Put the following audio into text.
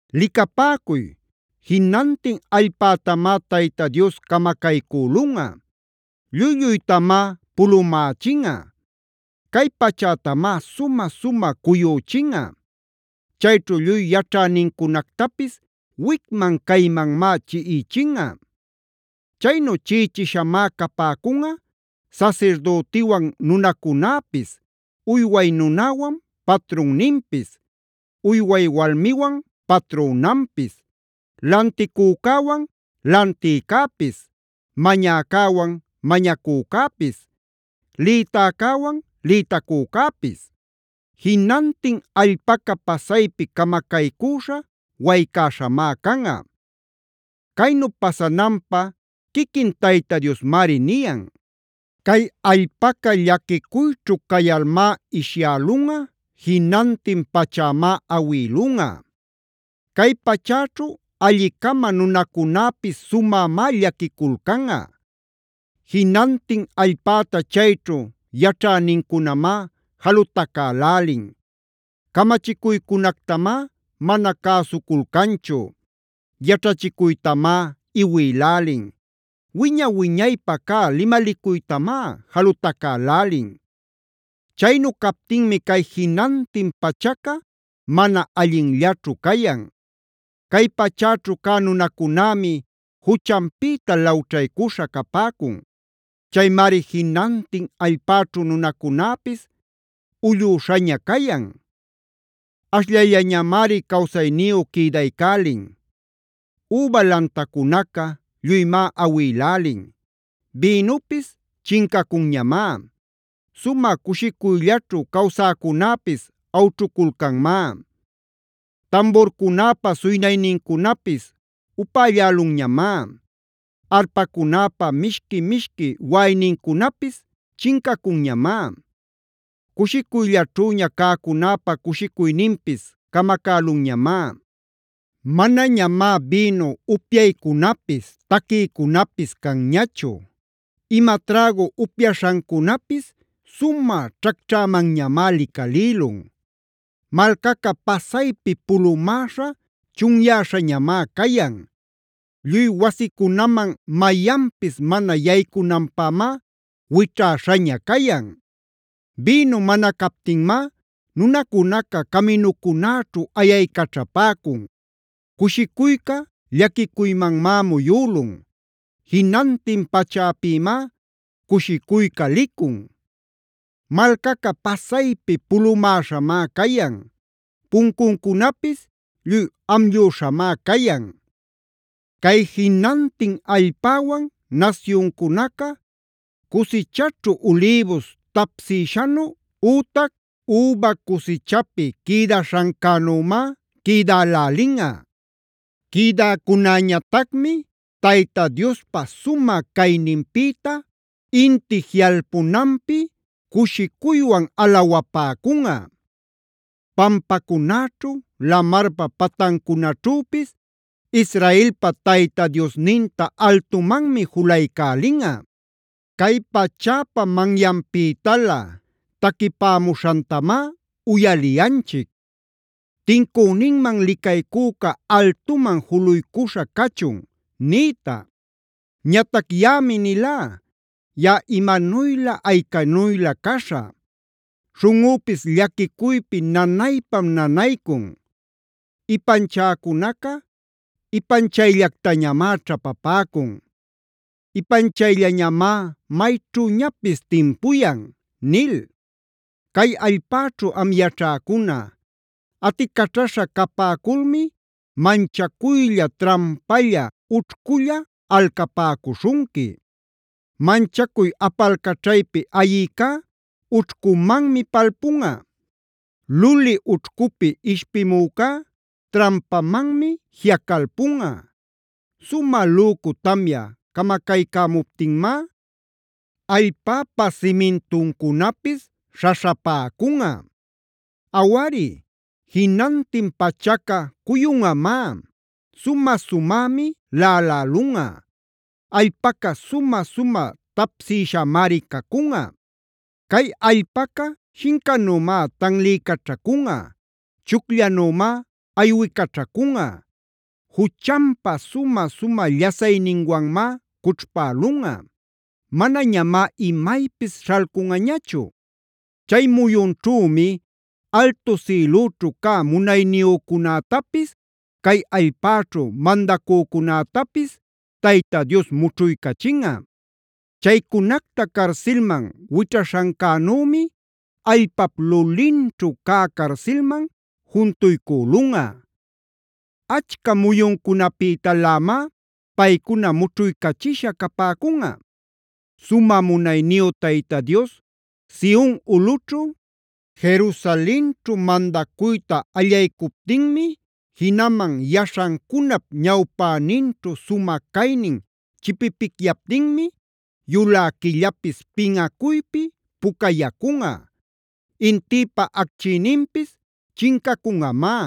Licapäcuy, jinantin allpätamá Tayta Dios camacaycülunꞌa; lluy-lluytamá pulumächinꞌa. Cay pachätamá sumä-sumä cuyüchinꞌa; chayćhu lluy yaćhänincunactapis wicman-caymanmá chiꞌichinꞌa. Chaynu chiꞌichishamá capäcunꞌa sasirdütiwan nunacunäpis, uyway nunäwan patrunninpis, uyway walmiwan patrünanpis, lanticücäwan lantïcäpis, mañäcäwan mañacücäpis, lïtäcäwan lïtacücäpis. Jinantin allpaca pasaypi camacaycüśha, waycäśhamá canꞌa. Caynu pasananpä quiquin Tayta Diosmari niyan. Cay allpaca llaquicuyćhu cayalmá ishyälunꞌa, jinantin pachämá awïlunꞌa. Cay pachäćhu alli-cama nunacunäpis sumämá llaquiculcanꞌa. Jinantin allpäta chayćhu yaćhänincunamá jalutacälälin. Camachicuycunactamá mana cäsuculcanchu; yaćhachicuytamá iwilälin; wiña-wiñaypä cä limalicuytamá jalutacälälin. Chaynu captinmi cay jinantin pachaca mana allinllaćhu cayan; cay pachäćhu cä nunacunämi juchanpïta lawćhaycuśha capäcun. Chaymari jinantin allpäćhu nunacunäpis ullüśhaña cayan; ashllayllañamari cawsayniyu quïdaycälin. Üba lantacunaca lluymá awilälin; bïnupis chincacunñamá; sumä cushicuyllaćhu cawsäcunäpis awćhuculcanmá. Tamburcunäpa suynaynincunapis upällälunñamá; arpacunäpa mishqui-mishqui waꞌaynincunapis chincacunñamá; cushicuyllaćhüña cäcunäpa cushicuyninpis camacälunñamá. Manañamá bïnu upyaycunapis, taquiycunapis canñachu. Ima trägu upyaśhancunapis sumä ćhacćhämanñamá licalïlun. Malcaca pasaypi pulumäśha chunyäśhañamá cayan; lluy wasicunaman mayanpis mana yaycunanpämá wićhäśhaña cayan. Bïnu mana captinmá nunacunaca caminucunäćhu ayaycaćhapäcun. Cushicuyca llaquicuymanmá muyülun; jinantin pachäpïmá cushicuyca licun. Malcaca pasaypi pulumäśhamá cayan; puncuncunapis lluy amllüśhamá cayan. Cay jinantin allpäwan nasyuncunaca cusichaćhu ulïbus tapsïshanu ütac üba cusichapi quïdaśhancänümá quïdälälinꞌa. Quïdäcunäñatacmi Tayta Diospa sumä cayninpïta inti jiꞌalpunanpi cushicuywan alawapäcunꞌa. Pampacunäćhu, lamarpa patancunaćhüpis Israelpa Tayta Diosninta altumanmi julaycälinꞌa. Cay pachäpa manyanpïtalä taquipämuśhantamá uyaliyanchic: “¡Tincüninman licaycüca altuman juluycuśha cachun!” nïta. Ñatac yaꞌami nilá: “¡Yaꞌa, imanuylä aycanuylä caśhä! ¡Śhunꞌüpis llaquicuypi nanaypam nanaycun! Ipanchäcunaca ipanchayllactañamá ćhapapäcun; ipanchayllañamá mayćhüñapis timpuyan” nil. Cay allpäćhu am yaćhäcuna, aticaćhaśha capäculmi manchacuylla, trampalla, ućhculla alcapäcuśhunqui. Manchacuy apalcaćhaypi ayicá ućhcumanmi palpunꞌa; luli ućhcupi ishpimücá trampamanmi jiꞌacalpunꞌa.a Sumä lücu tamya camacaycämuptinmá, allpäpa simintuncunapis śhaśhapäcunꞌa. Awari, jinantin pachaca cuyunꞌamá; sumä-sumämi laꞌalälunꞌa; allpaca sumä-sumä tapsïshamari cacunꞌa. Cay allpaca shincanümá tanliycaćhacunꞌa; chucllanümá aywicaćhacunꞌa. Juchanpa sumä-sumä llasayninwanmá cućhpälunꞌa; manañamá imaypis śhalcunꞌañachu. Chay muyunćhümi altu sïlüćhu cä munayniyücunätapis, cay allpäćhu mandacücunätapis Tayta Dios mućhuycachinꞌa. Chaycunacta carsilman wićhaśhancänümi allpap lulinćhu cä carsilman juntuycülunꞌa. Achca muyuncunapïtalämá paycuna mućhuycachisha capäcunꞌa. Sumä munayniyu Tayta Dios Sion ulꞌućhu, Jerusalenćhu mandacuyta allaycuptinmi, jinaman yaśhancunap ñawpäninćhu sumä caynin chipipicyaptinmi, yulä quillapis pinꞌacuypi pucayacunꞌa; intïpa achquiyninpis chincacunꞌamá.